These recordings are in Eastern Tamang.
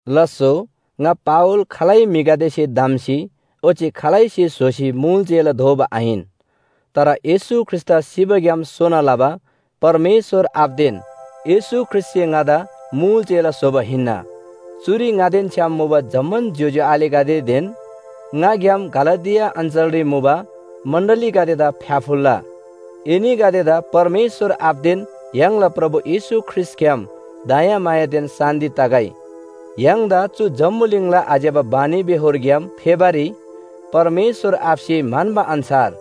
लास्‍सो ङा पावल खालै म्‍हिगदेसे धम्‍सी ओच्‍छे खालैसे स्‍होसी मुल चेला दोबा आहिन। तर येशू ख्रीष्‍टदा सिबाग्‍याम सोना लबा परमेश्‍वर आबादेन येशू ख्रीष्‍टसे ङादा मुल चेला स्‍होबा हिन्‍ना। चुरी ङादेन छ्‌याम मुबा जम्‍मान ज्‍योज्‍यो आलेगदेदेन ङाग्‍याम गलातिया अञ्‍चलरी मुबा मण्‍डलीगदेदा फ्‍याफुल्‍ला! एनीगदेदा परमेश्‍वर आबादेन य्‍हाङला प्रभु येशू ख्रीष्‍टग्‍याम दयामायादेन शान्‍ति तगै। य्‍हाङदा चु जम्‍बुलिङला आज्‍यबा बानीबेहोरग्‍याम फेबारी परमेश्‍वर आबासे म्‍हन्‍बा अन्‍छार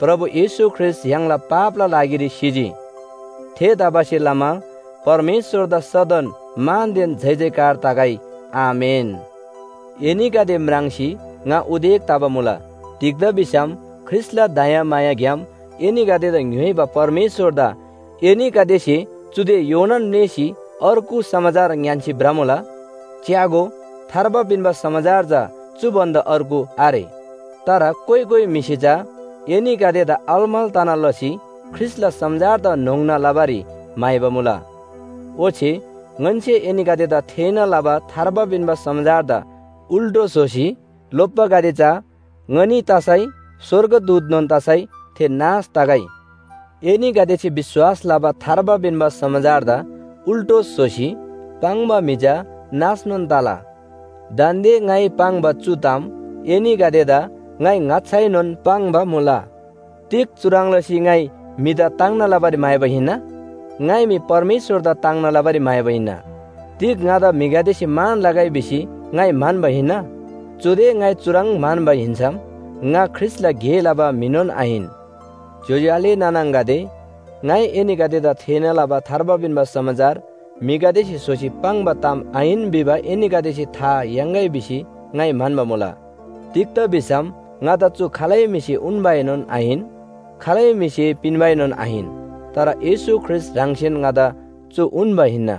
प्रभु येशू ख्रीष्‍ट य्‍हाङला पापला लागिरी सिजी। थेतबासेलमा परमेश्‍वरदा सदन मानदेन जयजयकार तगै। आमेन। एनीगदे म्राङ्सी ङा उदेक तबा मुला, तिग्‍दा भिसम ख्रीष्‍टला दयामायाग्‍याम एनीगदेदा ङ्‌योइबा परमेश्‍वरदा एनीगदेसे चुदे योनान म्‍लेःसी अर्गु समाचार ङ्‌यान्‍सी भ्रमुला। च्‍यागो, थार्बा पिन्‍बा समाचार चा चु भन्‍दा अर्गु आरे। तर कोइ कोइ म्‍हिसे चा एनीगदेदा अलमल तना लसी ख्रीष्‍टला समाचारदा न्‍होङ्ना लबारी म्‍हाइबा मुला। ओच्‍छे ङन्‍से एनीगदेदा थेःना लबा थार्बा पिन्‍बा समाचारदा उल्‍टो स्‍होसी लोप्‍बागदे चा, ङनी तसै स्‍वर्गदूतनोन तसै थे नाश तगै। एनीगदेसे विश्‍वास लबा थार्बा पिन्‍बा समाचारदा उल्‍टो स्‍होसी पाङ्बा म्‍हि चा नाशनोन तला। दान्‍दे ङाइ पाङ्बा चु ताम एनीगदेदा ङाइ ङाच्‍छाएनोन पाङ्बा मुला। तिग चुह्रङ् लसी ङाइ म्‍हिदा ताङ्ना लबारी म्‍हाइबा हिन्‍ना? ङाइ मी परमेश्‍वरदा ताङ्ना लबारी म्‍हाइबा हिन्‍ना। तिग ङादा म्‍हिगदेसे मान लगै भिसी ङाइ म्‍हन्‍बा हिन्‍ना? चुदे ङाइ चुह्रङ् म्‍हन्‍बा हिन्‍सम, ङा ख्रीष्‍टला गे लबा म्‍हिनोन आहिन। ज्‍योज्‍यो आले नाना आङागदे, ङाइ एनीगदेदा थेःना लबा थार्बा पिन्‍बा समाचार म्‍हिगदेसे स्‍होसी पाङ्बा ताम आहिन भिबा एनीगदेसे था याङ्‌गै भिसी ङाइ म्‍हन्‍बा मुला। तिग्‍दा भिसम ङादा चु खालै म्‍हिसे उन्‍बाएनोन आहिन, खालै म्‍हिसे पिन्‍बाएनोन आहिन। तर येशू ख्रीष्‍ट ह्राङसेन ङादा चु उन्‍बा हिन्‍ना।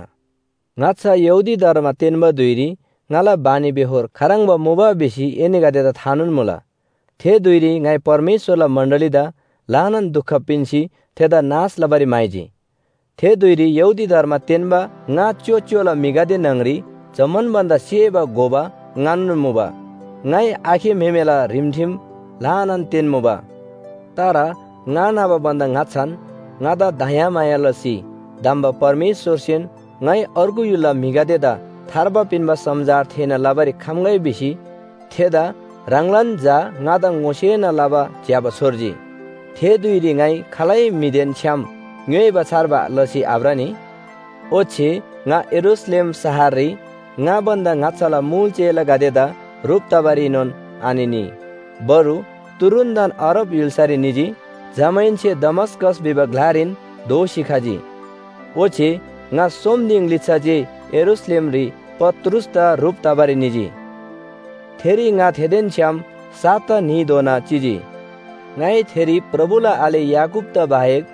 ङाच्‍छा यहूदी धर्म तेन्‍बा धुइरी ङाला बानीबेहोर खाह्रङ्बा मुबा भिसी एनीगदेदा थानोन मुला। थे धुइरी ङाइ परमेश्‍वरला मण्‍डलीदा ल्‍हानान दुख पिन्‍सी थेदा नाश लबारी म्‍हाइजी। थे धुइरी यहूदी धर्म तेन्‍बा ङा च्‍योच्‍योला म्‍हिगदे न्‍हङरी जम्‍मान भन्‍दा सेबा घोबा ङानोन मुबा। ङाइ आखे म्‍हेमेला रिमठिम ल्‍हानान तेन्‍मुबा। तर ङा न्‍हबा भन्‍दा ङाच्‍छान ङादा दयामाया लसी धम्‍बा परमेश्‍वरसेन, ङाइ अर्गु य्‍हुलला म्‍हिगदेदा थार्बा पिन्‍बा समाचार थेःना लबारी खम्‍गै भिसी थेदा ह्राङलान झा ङादा ङोसेना लबा ज्‍यबा छोर्जी। थे धुइरी ङाइ खालै म्‍हिदेन छ्‌याम ङ्‌योइबा छार्बा लसी आभ्रनी। ओच्‍छे ङा यरूशलेम शहररी ङा भन्‍दा ङाच्‍छाला मुल चेलागदेदा ह्रुप तबारीनोन आनिनी, बरु तुरुन्‍तन अरब य्‍हुल्‍सारी निजी। जमाहेन्‍से दमस्‍कस भिबा ग्‍लारीन दोःसी खजी। ओच्‍छे ङा सोम दिङ लिच्‍छा जे यरूशलेमरी पत्रुसदा ह्रुप तबारी निजी। थेरी ङा थेदेन छ्‌याम साता न्‍हीधोना चिजी। ङाइ थेरी प्रभुला आले याकूबदा बाहेक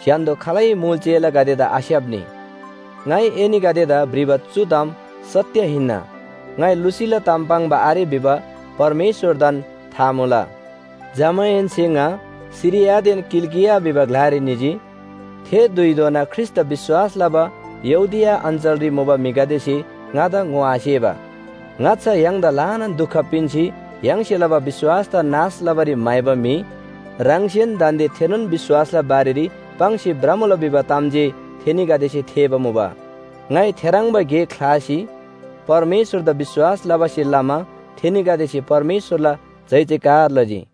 स्‍य्‍हान्‍दो खालै मुल चेलागदेदा आस्‍याप्‍नी। ङाइ एनीगदेदा भ्रिबा चु ताम सत्‍य हिन्‍ना, ङाइ लुसीला ताम पाङ्बा आरे भिबा परमेश्‍वरदान था मुला। जमाहेन्‍से ङा सिरियादेन किलिकिया भिबा ग्‍लारी निजी। थे धुइधोना ख्रीष्‍टदा विश्‍वास लबा यहूदिया अञ्‍चलरी मुबा म्‍हिगदेसे ङादा ङोआसेबा, “ङाच्‍छा य्‍हाङदा ल्‍हानान दुख पिन्‍सी य्‍हाङसे लबा विश्‍वासदा नाश लबारी म्‍हाइबा म्‍हि ह्राङसेन दान्‍दे थेनोन विश्‍वासला बारेरी पाङ्सी भ्रमुला” भिबा ताम जे थेनीगदेसे थेःबा मुबा। ङाइ थेह्रङ्बा गे ख्‍लासी परमेश्‍वरदा विश्‍वास लबासे लमा थेनीगदेसे परमेश्‍वरला जयजयकार लजी।